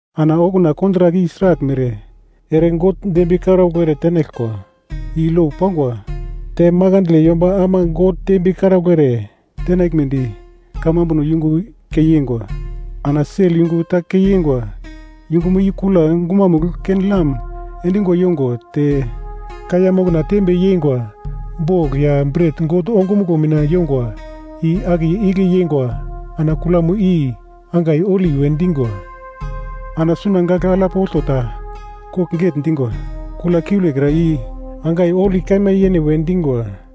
Ana okuna kontrak i sraglmere ere God dembiye karaugl ere tenaglkwa i lo pangwa te makandle yomba ama God dembiye karaugl ere tenaglmedi kamambuno yungu kei yeingwa. Ana sel yungu ta keingwa, yungumo i kula gumamugl ken-lam endingo yongo te kaiya mokna tembe yeingwa bogl ya bret God ongumuglo mina yongwa i akiye igle yeingwa ana Kulamo i angai Holi we dingwa. Ana suna gagl alap olto ta kogl getndingwa Kula kiulekra i angai Holi Kaima Yene we dingwa.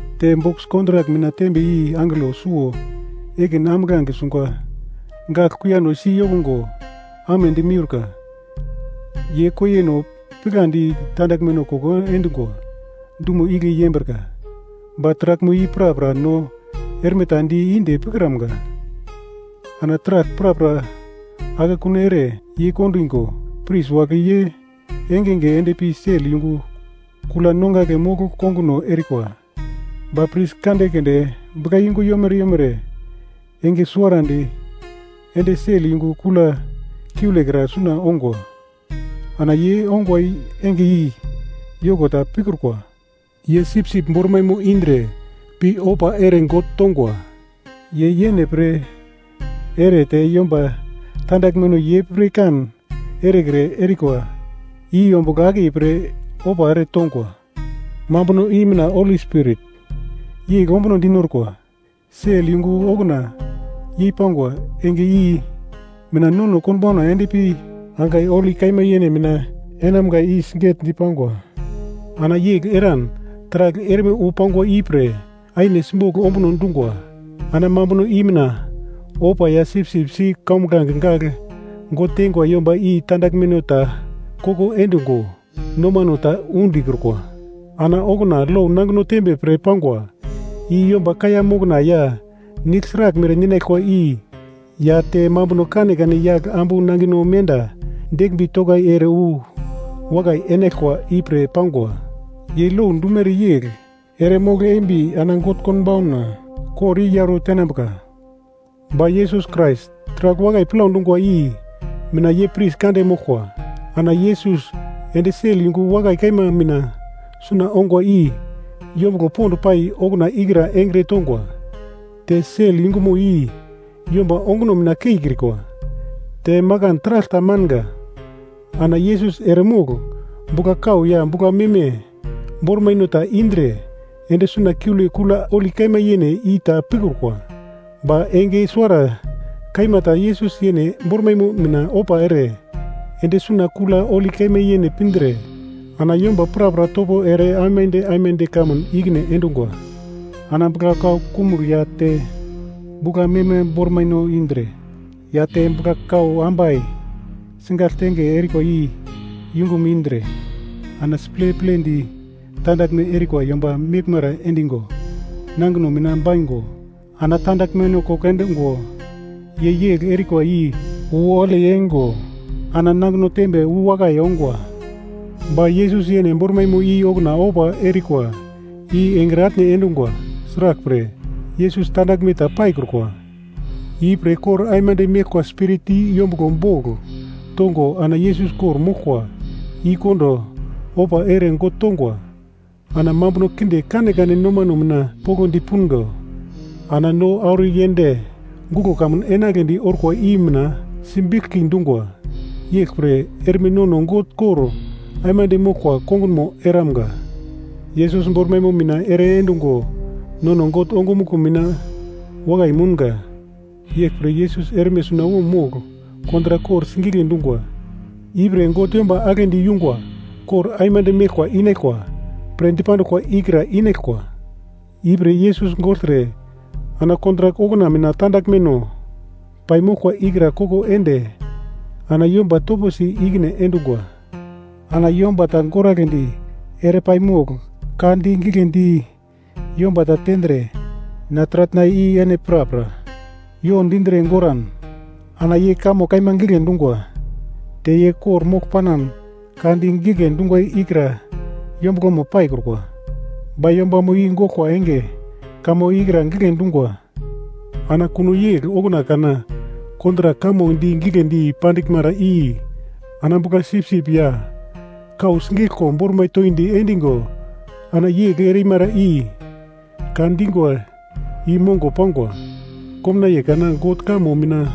Te bokis kontrak mina tembe i angelo suwo ekin ambuglange sungwa gagl kuiyano si yokungo amedi miurka, ye koiyeno pigladi tandaglme koko endingwa dumo igle yembrika. Ba taraglmo i prapra no erme ta di inde pikramga. Ana taragl prapra akekun ere yeikondigo, pris wagle ye engenge endpi sel yungu kula nongagle mogl konguno erikwa. Ba pris kande keunde buglayungu yomere yomere enge suwarandi ende sel yungu kula kiulekra suna ongwa, ana ye ongwa enge i yoko ta pikrukwa, ye sipsip bormaimo indre pi ofa ere God tongwa, ye yene pre ere te yomba tandaglmeno ye pirkan erekre erikwa i ombugl akiye pre ofa ere tongwa. Mambuno i mina Holi Spirit yegl ombuno dinorkwa, sel yungu okuna yei pangwa, enge i mina nono konbauna endpi angai Holi Kaima Yene mina enamga i sigetdi pangwa. Ana yegl eran taragl erme wu pangwa ipre aine simbogl ombuno dungwa. Ana mambuno i mina ofa ya sipsip si kombuglange gagl God teingwa yomba i tandaglmeno ta koko endungo nomano ta undikrukwa. Ana okuna lo nangino tembe pre pangwa, i yomba kaiya mokna ya nigl sraglmere ninaglkwa i ya te mambuno kanekane yagl ambu nangino menda deglmbi tokai ere wu wakai enaglkwa ipre pangwa, ye lo dumere yegl ere mogl eimbi ana God konbauna kor i yauro tenambuka. Ba Yesus Krais taragl wakai plau dungwa i mina ye pris kande moglkwa. Ana Yesus ende sel yungu wakai kaima mina suna ongwa i yombuglo pond pai okuna ikra engre tongwa. Te sel yungumo i yomba onguno mina keikrikwa, te makan taragl ta manga. Ana Yesus eremogl bugla-kau ya bugla-meme bormaino ta indre ende suna kiule Kula Holi Kaima Yene i ta pikrukwa. Ba enge suwara kaima ta Yesus yene bormaimo mina ofa ere ende suna Kula Holi Kaima Yene pindre ana yomba prapra topo ere aimande aimande kamun ikine endungwa. Ana bugla-kau kumugl ya te bugla-meme bormaino indre ya te bugla-kau ambai sigagl tenge erikwa i yungum indre, ana siple plendi tandaglme erikwa yomba meglmara endingo nangino mina baigo ana tandaglmeno koko endungwa, ye yegl erikwa i wu holi eingo ana nangino tembe wu wakai ongwa. Ba Yesus yene bormaimo i okuna ofa erikwa i engre atne endungwa. Sraglpre, Yesus tandaglme ta paikrukwa, ipre kor aimande meglkwa Spirit i yombuglo bogl tongo ana Yesus kor-moglkwa i kondo, ofa ere God tongwa. Ana mambuno kinde kanekane nomano mina poglodi pungo, ana no auro yend guglo kamun enagledi orkwa i mina simbiglki dungwa, yeglpre erme nono God kor aimande moglkwa kongunmo eramga. Yesus bormaimo mina ere endungo nono God ongumuglo mina wakai mounga. Yeglpre Yesus erme sunawom mogl kontrak kor sigigle dungwa, ipre God yomba aglendi yungwa kor aimande meglkwa inaglkwa pre dipanduglkwa ikra inaglkwa. Ipre Yesus gogltre ana kontrak okuna mina tandaglmeno paimoglkwa i ikra koko ende ana yomba toposi ikine endungwa. Ana yomba ta goragledi ere pai mogl ka di gigle di yomba ta tendre na taratna i ene prapra yo dindre goran ana ye kamo kaima gigle dungwa, te ye kor-mogl panan ka di gigle dungwa ikra yombuglomo paikrukwa. Ba yombamo i goglkwa enge kamo ikra gigle dungwa. Ana kuno yegl okuna kana kontrak kamo di giglendi pandiglmara i ana bugla-sipsip ya kau sigeglko bormai toindi endigo ana yegl erimara i ka dingwa i mongo pangwa. Komnaiye kana, God kamo mina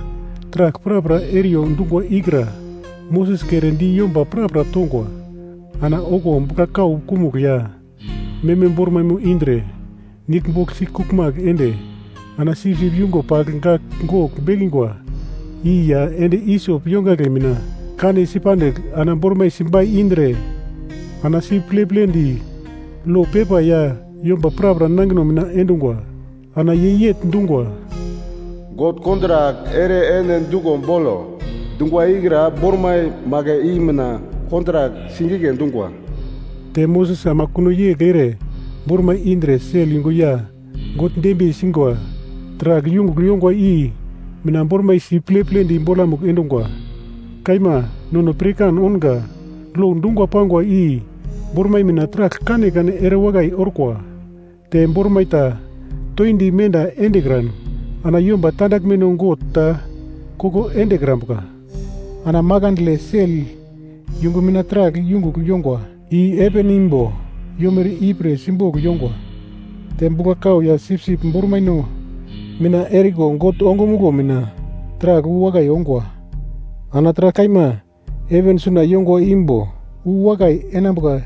taragl prapra eriyo dungwa ikra Moses kere di yomba prapra tongwa. Ana okuwo bugla-kau kumugl ya meme bormaimo indre nigl bogl sikuglmagl ende ana sipsip yungo pagl gagl gogl bekingwa i ya endi-isop yongagle mina kanesi pandigl ana bormai simbai indre ana si pleplendi lo pepa ya yomba prapra nangino mina endungwa. Ana ye yegl dungwa, “God kontrak ere ene duglo bolo, dungwa ikra bormai magl i mina kontrak sigigle dungwa.” Te Moses ama kuno yegl ere bormai indre, sel yungu ya God dembiye singwa taragl yungugl yongwa i mina bormai si pleplendi bolamugl endungwa. Kaima nono pirkan ounga, lo dungo pangwa i bormai mina taragl kanekane erewakai orkwa, te bormai ta toindi menda endekran, ana yomba tandaglmeno God ta koko endekrambuka. Ana makandle sel yungu mina taragl yungugl yongwa i heven imbo yomere ipre simbogl yongwa. Te bugla-kau ya sipsip bormaino mina eriko God ongumuglo mina taragl wu wakai ongwa. Ana taragl kaima heven suna yongwa imbo uwakai enambuka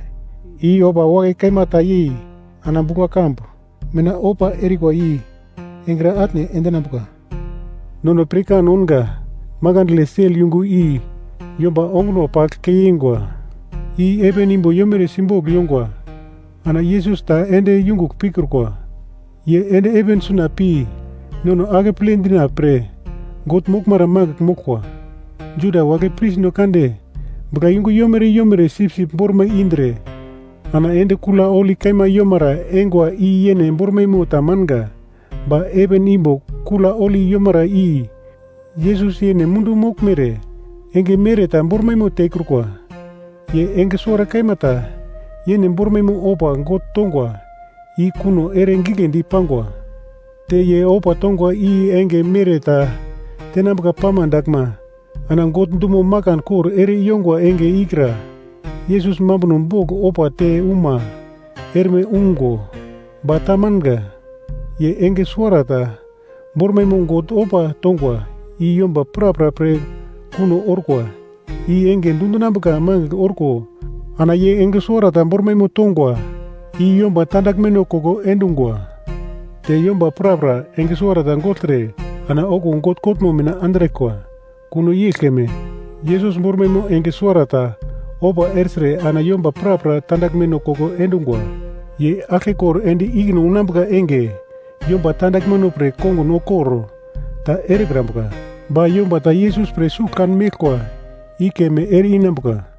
i ofa wakai kaima ta yei ana bugla-kambu mina ofa erikwa i engre atne endinambuka. Nono pirkan ounga, makandle sel yungu i yomba onguno pagl kei yeingwa i heven imbo yomere simbogl yongwa, ana Yesus ta ende yungugl pikrukwa. Ye ende heven suna pi nono akeple dina pre God moglmara magl moglkwa. Juda wagle prisno kande buglayungu yomere yomere sipsip bormai indre ana ende kula holi kaima yomara eingwa i yene bormaimo tamanga, ba heven imbo Kula Holi Yomara i Yesus yene mundu moglmere enge mere ta bormaimo tekrukwa. Ye enge suwara kaima ta yene bormaimo ofa God tongwa i kuno ere giglendi pangwa. Te ye ofa tongwa i enge mere ta tenambuka pama daglma, ana God dumo makan kor ere yongwa enge ikra Yesus mambuno bogl ofa te uma erme ungo. Ba tamanga, ye enge suwarata bormaimo God ofa tongwa i yomba prapra pre kuno orkwa. I enge dundinambuka magl orko ana ye enge suwarata bormaimo tongwa i yomba tandaglmeno koko endungwa. Te yomba prapra enge suwarata gogltre ana okuwo God kotmo mina andraglkwa. Kuno yegl keme, Yesus bormaimo enge suwara ta ofa ertre, ana yomba prapra tandaglmeno koko endungwa. Ye aglkekor ende ikine unambuka enge, yomba tandaglmeno pre kongun kor ta erekrambuka, ba yomba ta Yesus pre sugl kan meglkwa i keme ere-inambuka.